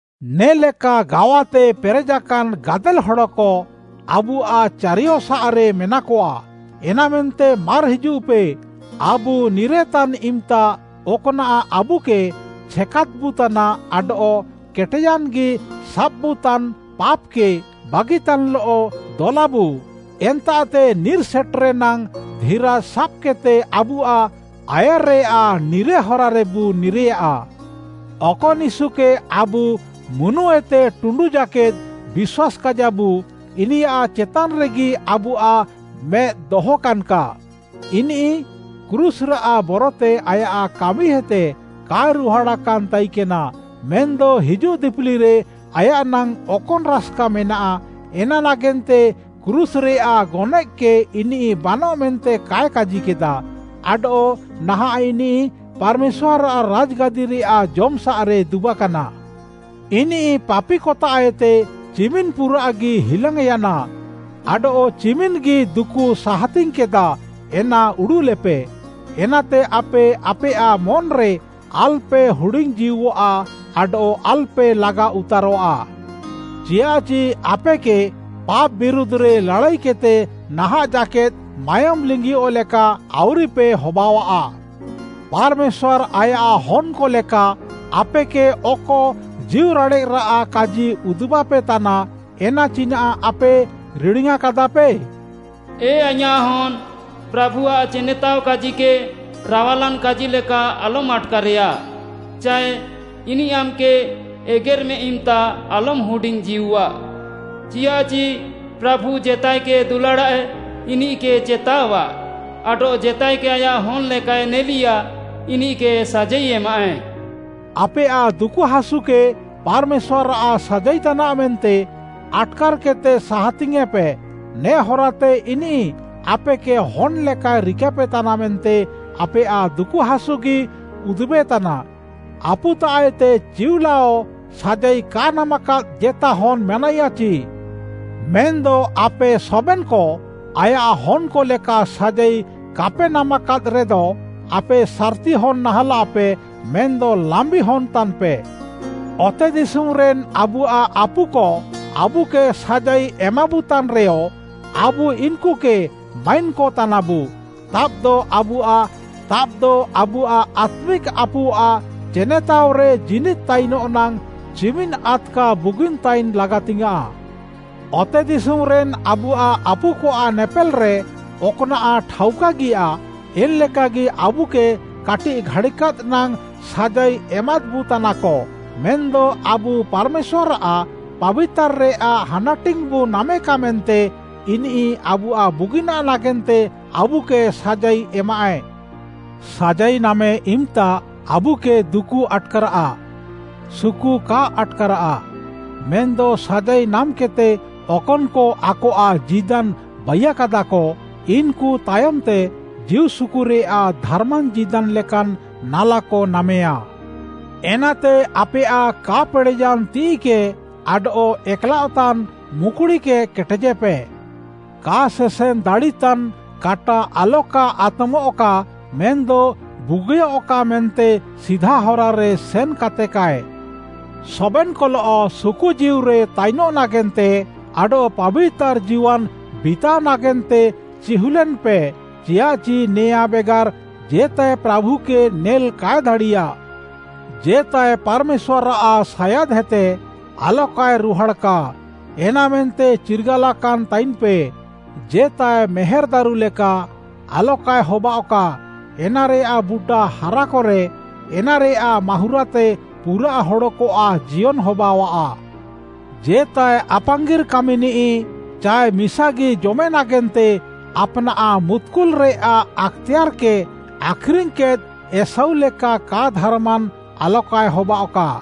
ନେ'ଲେକା ଗାୱାତେ ପେରେଜାକାନ୍‌ ଗାଦେଲ୍‌ ହଡ଼କ ଆବୁଆଃ ଚାରିୟସାଃରେ ମେନାକଆ, ଏନାମେନ୍ତେ ମାର୍‌ ହିଜୁଃପେ, ଆବୁ ନିରେତାନ୍‌ ଇମ୍‌ତା ଅକ୍‌ନାଃ ଆବୁକେ ଛେକାଦ୍‌ବୁତାନା ଆଡଃ କେଟେୟାନ୍‌ଗି ସାବ୍‌ବୁତାନ୍‌ ପାପ୍‌କେ ବାଗିତାନ୍‌ଲଃ, ଦଲାବୁ, ଏନ୍ତାଃତେ ନିର୍‌ ସେଟେରେ ନାଙ୍ଗ୍‌ ଧିରାଜ୍‌ ସାବ୍‌କେଦ୍‌ତେ ଆବୁଆଃ ଆୟାର୍‌ରେୟାଃ ନିର୍‌ରେ ହରାରେବୁ ନିର୍‌ରେୟା। ଅକନ୍‌ ୟୀଶୁକେ ଆବୁ ମୁନୁଏତେ ଟୁଣ୍ଡୁ ଜାକେଦ୍‌ ବିଶ୍ୱାସ୍‌କାଇଜାବୁ, ଇନିୟାଃ ଚେତାନ୍‌ରେଗି ଆବୁଆଃ ମେଦ୍‌ ଦହକାନ୍‌କା। ଇନିଃ କ୍ରୁଶ୍‌ରାଃ ବରତେ ଆୟାଃ କାମିହେତେ କାଏ ରୁହାଡ଼ାକାନ୍‌ ତାଇକେନା, ମେନ୍‌ଦ ହିଜୁଃ ଦିପିଲିରେ ଆୟାଃ ନାଙ୍ଗ୍‌ ଅକନ୍‌ ରାସ୍‌କା ମେନାଃ, ଏନା ନାଗେନ୍ତେ କ୍ରୁଶ୍‌ରେୟାଃ ଗନଏଃକେ ଇନିଃ ବାନଃ ମେନ୍ତେ କାଏ କାଜିକେଦା, ଆଡଃ ନାହାଁଃ ଇନିଃ ପାର୍‌ମେଶ୍ୱାର୍‌ଆଃ ରାଜ୍‌ଗାଦିରେୟାଃ ଜମ୍‌ସାଃରେ ଦୁବାକାନା। ଇନିଃ ପାପିକତାଃଏତେ ଚିମିନ୍‌ ପୁରାଃଗି ହିଲାଙ୍ଗ୍‌ୟାନା ଆଡଃ ଚିମିନ୍‌ଗି ଦୁକୁ ସାହାତିଙ୍ଗ୍‌କେଦା, ଏନା ଉଡ଼ୁଃଲେପେ! ଏନାତେ ଆପେ ଆପେୟାଃ ମନ୍‌ରେ ଆଲ୍‌ପେ ହୁଡିଙ୍ଗ୍‌ଜୀଉଃଆ ଆଡଃ ଆଲ୍‌ପେ ଲାଗାଉତାରଃଆ। ଚିୟାଃଚି ଆପେକେ ପାପ୍‌ ବିରୁଧ୍‌ରେ ଲାଡ଼ାଇକେଦ୍‌ତେ ନାହାଁଃ ଜାକେଦ୍‌ ମାୟୋମ୍‌ ଲିଙ୍ଗିୟଃ ଲେକା ଆଉରିପେ ହବାଅଃଆ। ପାର୍‌ମେଶ୍ୱାର୍‌ ଆୟାଃ ହନ୍‌କ ଲେକା ଆପେକେ ଅକ ଜୀଉରାଡ଼େଃରାଃ କାଜି ଉଦୁବାପେ ତାନା, ଏନା ଚିନାଃ ଆପେ ରିଡ଼ିୟାଁକାଦାପେ? “ଏ ଆଇଁୟାଃ ହନ୍‌, ପ୍ରାଭୁଆଃ ଚେନେତାଅ କାଜିକେ ରାୱାଲାନ୍‌ କାଜିଲେକା ଆଲମ୍‌ ଆଟ୍‌କାରେୟା, ଚାଏ ଇନିଃ ଆମ୍‌କେ ଏଗେର୍‌ମେ ଇମ୍‌ତା ଆଲମ୍‌ ହୁଡିଙ୍ଗ୍‌ଜୀଉଃଆ। ଚିୟାଃଚି ପ୍ରାଭୁ ଜେତାଏକେ ଦୁଲାଡ଼ାଃଏ, ଇନିଃକେ ଚେତାଅଆଃ, ଆଡଃ ଜେତାଏକେ ଆୟାଃ ହନ୍‌ ଲେକାଏ ନେଲିଆ, ଇନିଃକେ ସାଜାଇ ଏମାଃଏ।” ଆପେୟାଃ ଦୁକୁହାସୁକେ ପାର୍‌ମେଶ୍ୱାର୍‌ଆଃ ସାଜାଇତାନାଃ ମେନ୍ତେ ଆଟ୍‌କାର୍‌କେଦ୍‌ତେ ସାହାତିଙ୍ଗ୍‌ୟେଁପେ, ନେ ହରାତେ ଇନିଃ ଆପେକେ ହନ୍‌ ଲେକାଏ ରିକାପେତାନା ମେନ୍ତେ ଆପେୟାଃ ଦୁକୁହାସୁଗି ଉଦୁବେତାନା। ଆପୁତାଃଏତେ ଚିଉଲାଅ ସାଜାଇ କା ନାମାକାଦ୍‌ ଜେତା ହନ୍‌ ମେନାଇୟା ଚି? ମେନ୍‌ଦ ଆପେ ସବେନ୍‌କ ଆୟାଃ ହନ୍‌କ ଲେକା ସାଜାଇ କାପେ ନାମାକାଦ୍‌ରେଦ, ଆପେ ସାର୍‌ତି ହନ୍‌ ନାହାଁଲାପେ, ମେନ୍‌ଦ ଲାମ୍ବି ହନ୍‌ତାନ୍‌ପେ। ଅତେଦିଶୁମ୍‌ରେନ୍‌ ଆବୁଆଃ ଆପୁକ ଆବୁକେ ସାଜାଇ ଏମାବୁତାନ୍‌ରେୟ, ଆବୁ ଇନ୍‌କୁକେ ମାଇନ୍‌କ ତାନାବୁ, ତାବ୍‌ଦ ଆବୁଆଃ ଆତ୍ମିକ୍‌ ଆପୁଆଃ ଚେନେତାଅରେ ଜୀନିଦ୍‌ ତାଇନଃ ନାଙ୍ଗ୍‌ ଚିମିନ୍‌ ଆଦ୍‌କା ବୁଗିନ୍‌ ତାଇନ୍‌ ଲାଗାତିଙ୍ଗ୍‌ୟାଁଃ! ଅତେଦିଶୁମ୍‌ରେନ୍‌ ଆବୁଆଃ ଆପୁକଆଃ ନେପେଲ୍‌ରେ ଅକ୍‌ନାଃ ଠାଉକାଗିୟା, ଏନ୍‌ଲେକାଗି ଆବୁକେ କାଟିଃ ଘାଡ଼ିକାଦ୍‌ ନାଙ୍ଗ୍‌ ସାଜାଇ ଏମାଦ୍‌ବୁତାନାକ, ମେନ୍‌ଦ ଆବୁ ପାର୍‌ମେଶ୍ୱାର୍‌ଆଃ ପାବିତାର୍‌ରେୟାଃ ହାନାଟିଙ୍ଗ୍‌ବୁ ନାମେକା ମେନ୍ତେ ଇନିଃ ଆବୁଆଃ ବୁଗିନାଃ ନାଗେନ୍ତେ ଆବୁକେ ସାଜାଇ ଏମାଃଏ। ସାଜାଇ ନାମେ ଇମ୍‌ତା ଆବୁକେ ଦୁକୁ ଆଟ୍‌କାରାଃ, ସୁକୁ କା ଆଟ୍‌କାରାଃ। ମେନ୍‌ଦ ସାଜାଇ ନାମ୍‌କେଦ୍‌ତେ ଅକନ୍‌କ ଆକଆଃ ଜୀଦାନ୍‌ ବାଇୟାକାଦାକ, ଇନ୍‌କୁ ତାୟମ୍‌ତେ ଜୀଉସୁକୁରେୟାଃ ଧାର୍‌ମାନ୍‌ ଜୀଦାନ୍‌ ଲେକାନ୍‌ ନାଲାକ ନାମେୟା। ଏନାତେ ଆପେୟାଃ କା ପେଡ଼େୟାନ୍‌ ତିଃଇକେ ଆଡଃ ଏକ୍‌ଲାଅଃତାନ୍‌ ମୁକ୍‌ଡ଼ିକେ କେଟେଜେପେ। କା ସେସେନ୍‌ ଦାଡ଼ିତାନ୍‌ କାଟା ଆଲକା ଆତ୍‌ମଃକା ମେନ୍‌ଦ ବୁଗିୟଃକା ମେନ୍ତେ ସିଧା ହରାରେ ସେନ୍‌କାତେକାଏ। ସବେନ୍‌କଲଃ ସୁକୁଜୀଉରେ ତାଇନଃ ନାଗେନ୍ତେ ଆଡଃ ପାବିତାର୍‌ ଜୀୱାନ୍‌ ବିତାଅ ନାଗେନ୍ତେ ଚିହୁଲେନ୍‌ପେ, ଚିୟାଃଚି ନେଆଁଁ ବେଗାର୍‌ ଜେତାଏ ପ୍ରାଭୁକେ ନେଲ୍‌ କାଏ ଦାଡ଼ିୟା। ଜେତାଏ ପାର୍‌ମେଶ୍ୱାର୍‌ଆଃ ସାୟାଦ୍‌ହେତେ ଆଲକାଏ ରୁହାଡ଼୍‌କା, ଏନାମେନ୍ତେ ଚିର୍ଗାଲାକାନ୍‌ ତାଇନ୍‌ପେ। ଜେତାଏ ମେହେର୍‌ ଦାରୁ ଲେକା ଆଲକାଏ ହବାଅଃକା, ଏନାରେୟାଃ ବୁଟା ହାରାକରେ, ଏନାରେୟାଃ ମାହୁଁରାତେ ପୁରାଃ ହଡ଼କଆଃ ଜିୟନ୍‌ ହବାଅଃଆ। ଜେତାଏ ଆପାଙ୍ଗିର୍‌ କାମିନିଃ ଚାଏ ମିସାଗି ଜମେ ନାଗେନ୍ତେ ଆପ୍‌ନାଃ ମୁତ୍‌କୁଲ୍‌ରେୟାଃ ଆକ୍‌ତେୟାର୍‌କେ ଆଖ୍‌ରିଙ୍ଗ୍‌କେଦ୍‌ ଏଷୌ ଲେକା କା ଧାର୍‌ମାନ୍‌ ଆଲକାଏ ହବାଅଃକା।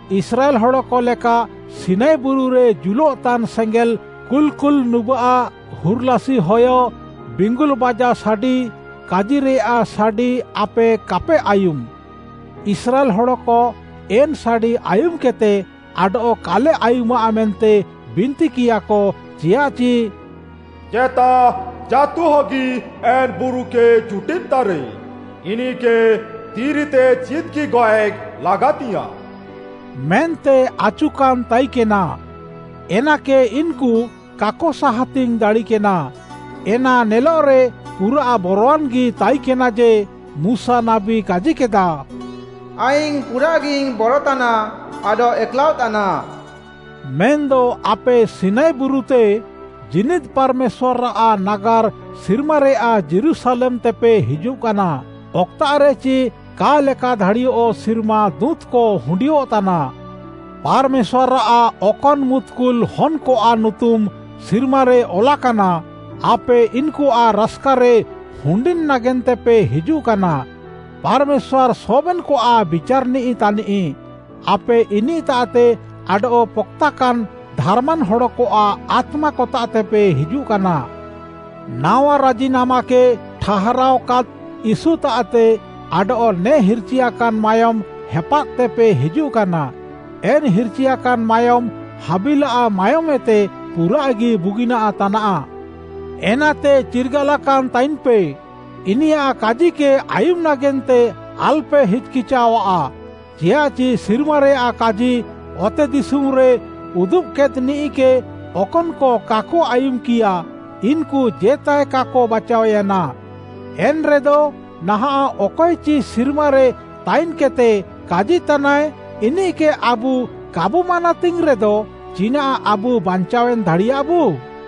ଇସ୍ରାଏଲ୍‌ ହଡ଼କ ଲେକା ସିନାଇ ବୁରୁରେ ଜୁଲଃତାନ୍‌ ସେଙ୍ଗେଲ୍‌, କୁଲ୍‌କୁଲ୍‌ ନୁବାଃ, ହୁର୍‌ଲାସି ହୟ, ବିଙ୍ଗୁଲ୍‌ ବାଜା ସାଡ଼ି, କାଜିରେୟାଃ ସାଡ଼ି ଆପେ କାପେ ଆୟୁମ୍‌। ଇସ୍ରାଏଲ୍‌ ହଡ଼କ ଏନ୍‌ ସାଡ଼ି ଆୟୁମ୍‌କେଦ୍‌ତେ, ଆଡଃ କାଲେ ଆୟୁମାଃ ମେନ୍ତେ ବିନ୍ତିକିୟାକ, ଚିୟାଃଚି “ଜେତା ଜାଁତୁହଗି ଏନ୍‌ ବୁରୁକେ ଜୁଟିଦ୍‌ତାରେ, ଇନିଃକେ ଦିରିତେ ଚିଦ୍‌ଗି ଗଏଃ ଲାଗାତିଙ୍ଗ୍‌ୟାଁଃ” ମେନ୍ତେ ଆଚୁକାନ୍‌ ତାଇକେନା, ଏନାକେ ଇନ୍‌କୁ କାକ ସାହାତିଙ୍ଗ୍‌ ଦାଡ଼ିକେନା। ଏନା ନେଲଃରେ ପୁରାଃ ବରୱାନ୍‌ଗି ତାଇକେନା ଯେ, ମୁଶା ନାବୀ କାଜିକେଦା, “ଆଇଙ୍ଗ୍‌ ପୁରାଃଗିଇଙ୍ଗ୍‌ ବରତାନା ଆଡଃ ଏକ୍‌ଲାଅଃତାନା।” ମେନ୍‌ଦ ଆପେ ସିନାଇ ବୁରୁତେ, ଜୀନିଦ୍‌ ପାର୍‌ମେଶ୍ୱାର୍‌ଆଃ ନାଗାର୍‌ ସିର୍ମାରେୟାଃ ଯୀରୁଶାଲେମ୍‌ତେପେ ହିଜୁଃକାନା, ଅକ୍‌ତାଃରେଚି କା ଲେକାଦାଡ଼ିୟଃ ସିର୍ମା ଦୁଁତ୍‌କ ହୁଣ୍ଡିୟଃତାନା। ପାର୍‌ମେଶ୍ୱାର୍‌ଆଃ ଅକନ୍‌ ମୁତ୍‌କୁଲ୍‌ ହନ୍‌କଆଃ ନୁତୁମ୍‌ ସିର୍ମାରେ ଅଲାକାନା, ଆପେ ଇନ୍‌କୁଆଃ ରାସ୍‌କାରେ ହୁଣ୍ଡିନ୍‌ ନାଗେନ୍ତେପେ ହିଜୁଃକାନା। ପାର୍‌ମେଶ୍ୱାର୍‌ ସବେନ୍‌କଆଃ ବିଚାର୍‌ନିଃ ତାନିଃ, ଆପେ ଇନିଃତାଃତେ ଆଡଃ ପକ୍‌ତାକାନ୍‌ ଧାର୍‌ମାନ୍‌ ହଡ଼କଆଃ ଆତ୍ମାକତାଃତେପେ ହିଜୁଃକାନା। ନାୱା ରାଜିନାମାକେ ଠାହାରାଅକାଦ୍‌ ୟୀଶୁତାଃତେ ଆଡଃ ନେ ହିର୍‌ଚିୟାକାନ୍‌ ମାୟୋମ୍‌ ହେପାଦ୍‌ତେପେ ହିଜୁଃକାନା। ଏନ୍‌ ହିର୍‌ଚିୟାକାନ୍‌ ମାୟୋମ୍‌ ହାବିଲ୍‌ଆଃ ମାୟୋମ୍‌ଏତେ ପୁରାଃଗି ବୁଗିନାଃ ତାନାଃ। ଏନାତେ ଚିର୍ଗାଲାକାନ୍‌ ତାଇନ୍‌ପେ, ଇନିୟାଃ କାଜିକେ ଆୟୁମ୍‌ ନାଗେନ୍ତେ ଆଲ୍‌ପେ ହିଚ୍‌କିଚାଅଃଆ, ଚିୟାଃଚି ସିର୍ମାରେୟାଃ କାଜି ଅତେଦିଶୁମ୍‌ରେ ଉଦୁବ୍‌କେଦ୍‌ନିଃକେ ଅକନ୍‌କ କାକ ଆୟୁମ୍‌କିୟା, ଇନ୍‌କୁ ଜେତାଏ କାକ ବାଚାଅୟାନା। ଏନ୍‌ରେଦ, ନାହାଁଃ ଅକଏଚି ସିର୍ମାରେ ତାଇନ୍‌କେଦ୍‌ତେ କାଜିତାନାଏ, ଇନିଃକେ ଆବୁ କାବୁ ମାନାତିଙ୍ଗ୍‌ରେଦ ଚିନାଃ ଆବୁ ବାଞ୍ଚାୱେନ୍‌ ଦାଡ଼ିୟାବୁ?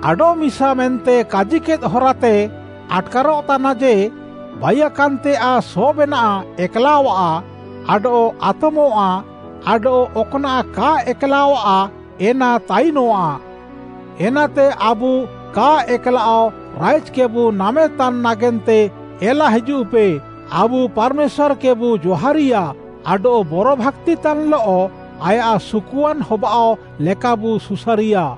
“ଆଡଃମିସା” ମେନ୍ତେ କାଜିକେଦ୍‌ ହରାତେ ଆଟ୍‌କାରଃତାନା ଯେ, ବାଇୟାକାନ୍‌ତେୟାଃ ସବେନାଃ ଏକ୍‌ଲାଅଃଆ ଆଡଃ ଆତମଃଆ ଆଡଃ ଅକ୍‌ନାଃ କା ଏକ୍‌ଲାଅଃଆ ଏନା ତାଇନଃଆ। ଏନାତେ ଆବୁ କା ଏକ୍‌ଲାଅଃ ରାଇଜ୍‌କେବୁ ନାମେତାନ୍‌ ନାଗେନ୍ତେ ଏଲା ହିଜୁଃପେ, ଆବୁ ପାର୍‌ମେଶ୍ୱାର୍‌କେବୁ ଜହାରିୟା ଆଡଃ ବରଭାକ୍ତିତାନ୍‌ଲଃ ଆୟାଃ ସୁକୁଆନ୍‌ ହବାଅଃ ଲେକାବୁ ସୁସାରିୟା।